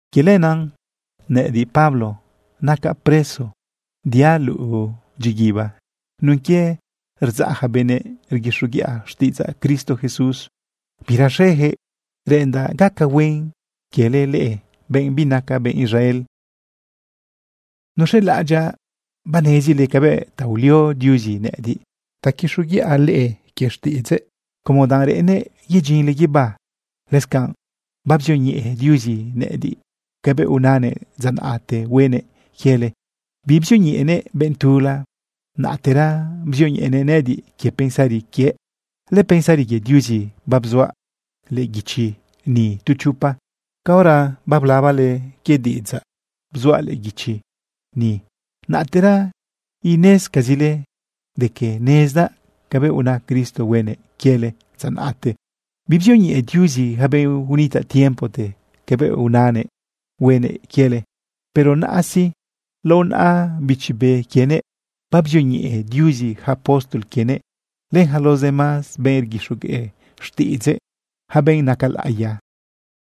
Quie lenaꞌ nëꞌëdiꞌ, Pablo, nacaꞌ preso diaꞌ luꞌu dyiguiba nun quie rdzaꞌ ja benëꞌ rguixoguiꞌa xtiꞌidzaꞌ Cristo Jesús. Biraxejëꞌ reꞌendaꞌ gaca huen quiele leꞌe, benꞌ binaca benꞌ Israel. Nuz̃elaꞌadyaꞌ banezile cabëꞌ ta ulio Diuzi nëꞌëdiꞌ ta quixoguiꞌa leꞌe quie xtiꞌidzëꞌ como danꞌ reꞌennëꞌ yedyinle guibá. Lëscanꞌ babzioñeꞌe Diuzi nëꞌëdiꞌ cabëꞌ unanëꞌ dza naꞌte huenëꞌ quiele. Bibzioñeꞌenëꞌ benꞌ tula. Naꞌtera bzioñeꞌenëꞌ nëꞌëdiꞌ quie pensari quiëꞌ. Lëpensari quie Diuzi babzuaꞌ lëꞌë guichi ni tu chopa. Caora bablabale quie diꞌidzaꞌ bzuaꞌ lëꞌë guichi ni, naꞌtera inezcazile de que nezdaꞌ cabëꞌ una Cristo huenëꞌ quiele dza naꞌte. Bibzioñeꞌe Diuzi yaca benꞌ unitaꞌ tiempote cabëꞌ unanëꞌ huenëꞌ quiele. Pero naꞌa sí, lao naꞌa Bichi Be quienëꞌ, babzioñeꞌe Diuzi yaca apóstol quienëꞌ len yaca los demás benꞌ rguixogueꞌ xtiꞌidzëꞌ, yaca benꞌ naca laꞌiya.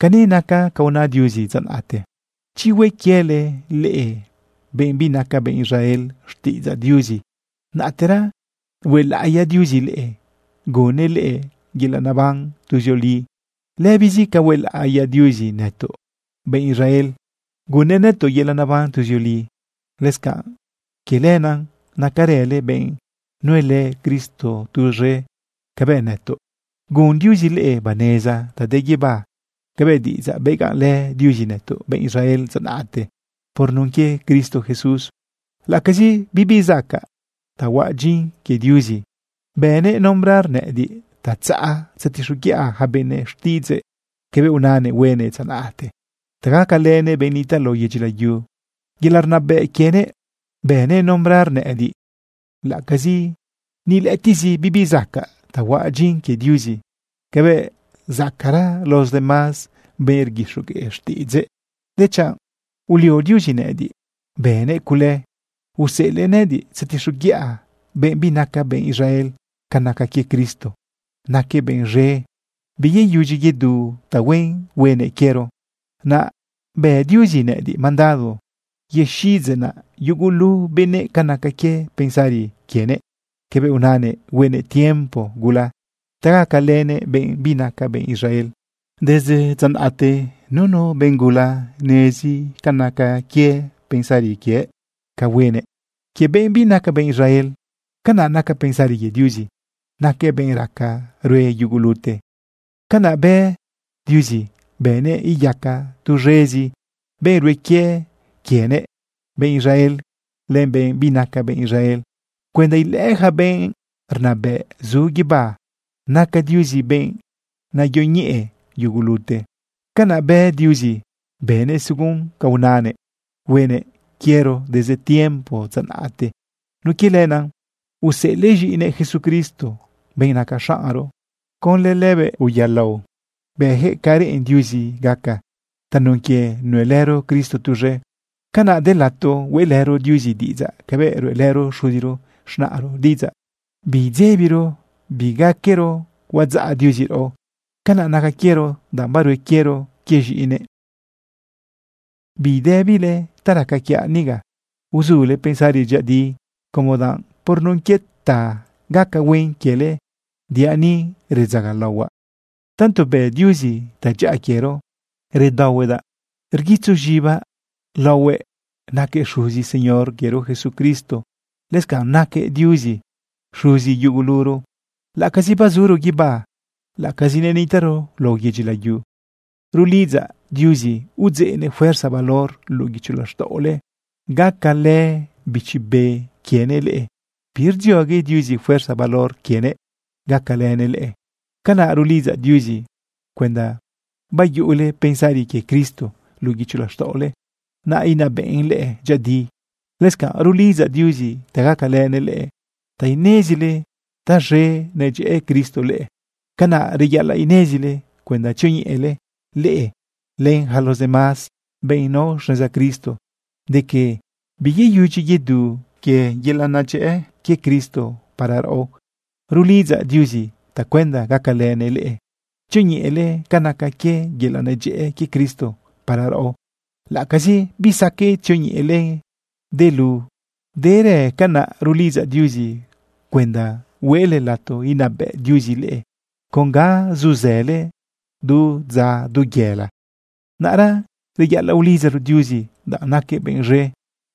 Cani naca ca una Diuzi dza naꞌte: Chi hue quiele leꞌe benꞌ binaca benꞌ Israel xtiꞌidzaꞌ Diuzi, naꞌtera huelaꞌiya Diuzi leꞌe, gunnëꞌ leꞌe yelaꞌ neban tuzioli lëbizi ca huelaꞌiya Diuzi nëtoꞌ benꞌ Israel, gunnëꞌ nëtoꞌ yelaꞌ neban tuzioli. Lëscanꞌ quie lenaꞌ, nacarële benꞌ nuelë Cristo tuz̃e cabëꞌ nëtoꞌ. Gun Diuzi leꞌe baneza ta de guibá cabëꞌ diꞌidzaꞌ begaꞌnlë Diuzi nëtoꞌ benꞌ Israel dza naꞌte por nun quie Cristo Jesús. Laꞌacazi bibi zacaꞌ ta huaꞌ dyin quie Diuzi, bënëꞌ nombrar nëꞌëdiꞌ ta tzaꞌa tzetixoguiꞌa yaca benëꞌ xtiꞌidzëꞌ cabëꞌ unanëꞌ huenëꞌ dza naꞌte ta gacalënëꞌ benꞌ nitaꞌ lao yedyi layu. Yelaꞌ rnabëꞌ quienëꞌ bënëꞌ nombrar nëꞌëdiꞌ. Laꞌacazi ni lëꞌëtiꞌzi bibi zacaꞌ ta huaꞌ dyin quie Diuzi cabëꞌ zacaꞌra los demás benꞌ rguixogueꞌ xtiꞌidzëꞌ, dechanꞌ ulio Diuzi nëꞌëdiꞌ, bënëꞌ cule, useꞌelëꞌ nëꞌëdiꞌ tzetixoguiꞌa benꞌ binaca benꞌ Israel ca naca quie Cristo, naquëꞌ benꞌ z̃e, biyeyudyi yedu tahuen huenëꞌ quiero. Naꞌ bë Diuzi nëꞌëdiꞌ mandado yexiꞌidzeꞌnaꞌ yugulu benëꞌ ca naca quie pensari quienëꞌ cabëꞌ unanëꞌ huenëꞌ tiempo gula ta gacalënëꞌ benꞌ binaca benꞌ Israel. Desde dza naꞌte nunu benꞌ gula nezi ca naca quie pensari quiëꞌ ca huenëꞌ quie benꞌ binaca benꞌ Israel. Canaꞌ naca pensari quie Diuzi, naquëꞌ benꞌ raca rue yugulute. Canaꞌ bë Diuzi bënëꞌ iyaca tuz̃ezi benꞌ rue quie quienëꞌ, benꞌ Israel len benꞌ binaca benꞌ Israel, cuenda ilëꞌë yaca benꞌ rnabëꞌ zu guibá naca Diuzi benꞌ nayoñeꞌe yugulute. Canaꞌ bë Diuzi, bënëꞌ según ca unanëꞌ huenëꞌ quiero desde tiempo dza naꞌte. Nun quie lenaꞌ useꞌelëꞌ z̃iꞌinëꞌ Jesucristo, benꞌ naca xaꞌnro. Conlë lëbëꞌ uyaꞌlao bëyaquëꞌ ca reꞌen Diuzi gaca. Tanun quie nuelëro Cristo tuz̃e, canaꞌ de lato hueꞌlëro Diuzi diꞌidzaꞌ cabëꞌ ruꞌelëro xuzi z̃naꞌro diꞌidzaꞌ. Biidzebiro bigaquero huadzaꞌ Diuzi raꞌo. Canaꞌ naca quiero danꞌ barue quiero quie z̃iꞌinëꞌ. Bidëbile ta raca quiaꞌ niga. Uzule pensari dyëꞌëdi, como danꞌ por nun quie ta gaca huen quiele diaꞌ ni redzagalaohuaꞌ. Tanto bë Diuzi tadyaꞌa quiero, redaohuedaꞌ rguitzu z̃ibaꞌ laohuëꞌ naquëꞌ Xuzi Señor quiero Jesucristo. Lëscanꞌ naquëꞌ Diuzi Xuzi yuguluro, laꞌacazi bazuro guibá, laꞌacazi nenitaꞌro lao yedyi layu. Rulidzaꞌ Diuzi udzeꞌnëꞌ fuerza valor luꞌu guicho laxtaꞌole gacalë Bichi Be quienëꞌ leꞌe. Birdziogue Diuzi fuerza valor quienëꞌ gacalënëꞌ leꞌe. Canaꞌ rulidzaꞌ Diuzi cuenda bayuꞌule pensari quie Cristo luꞌu guicho laxtaꞌole, naꞌ inabëꞌn leꞌe dyëꞌëdi. Lëscanꞌ rulidzaꞌ Diuzi ta gacalënëꞌ leꞌe ta inezile taz̃e nedyëꞌë Cristo leꞌe. Canaꞌ reyaꞌalaꞌ inezile cuenda tzioñeꞌele leꞌe, len yaca los demás benꞌ nao xneza Cristo, de que biyeyudyi yedu quie yelaꞌ nedyëꞌë quie Cristo para raꞌo. Rulidzaꞌ Diuzi tacuenda gacalënëꞌ leꞌe tzioñeꞌele ca naca quie yelaꞌ nedyëꞌë quie Cristo para raꞌo, laꞌacazi bisaqueꞌ tzioñeꞌelen delu derëꞌ. Canaꞌ rulidzaꞌ Diuzi cuenda hueꞌle lato inabëꞌ Diuzi leꞌe con ga zuzële du dza du yela. Naꞌra reyaꞌalaꞌ ulidzaro Diuzi danꞌ naquëꞌ benꞌ z̃e.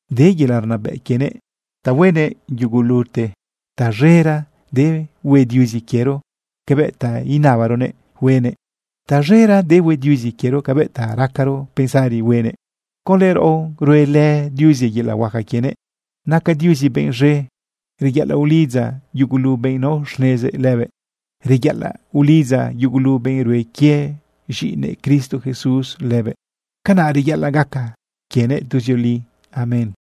De yelaꞌ rnabëꞌ quienëꞌ ta huenëꞌ yugulute. Taz̃era de hue Diuzi quiero cabëꞌ ta inabaronëꞌ huenëꞌ. Taz̃era de hue Diuzi quiero cabëꞌ ta racaro pensari huenëꞌ. Conlë raꞌo ruelë Diuzi yelaꞌ huaca quienëꞌ. Naca Diuzi benꞌ z̃e. Reyaꞌalaꞌ ulidza yugulu benꞌ nao xnezëꞌ lëbëꞌ. Reyaꞌalaꞌ ulidza yugulu benꞌ rue quie z̃iꞌinëꞌ Cristo Jesús lëbëꞌ. Canaꞌ reyaꞌalaꞌ gaca quienëꞌ tuzioli. Amén.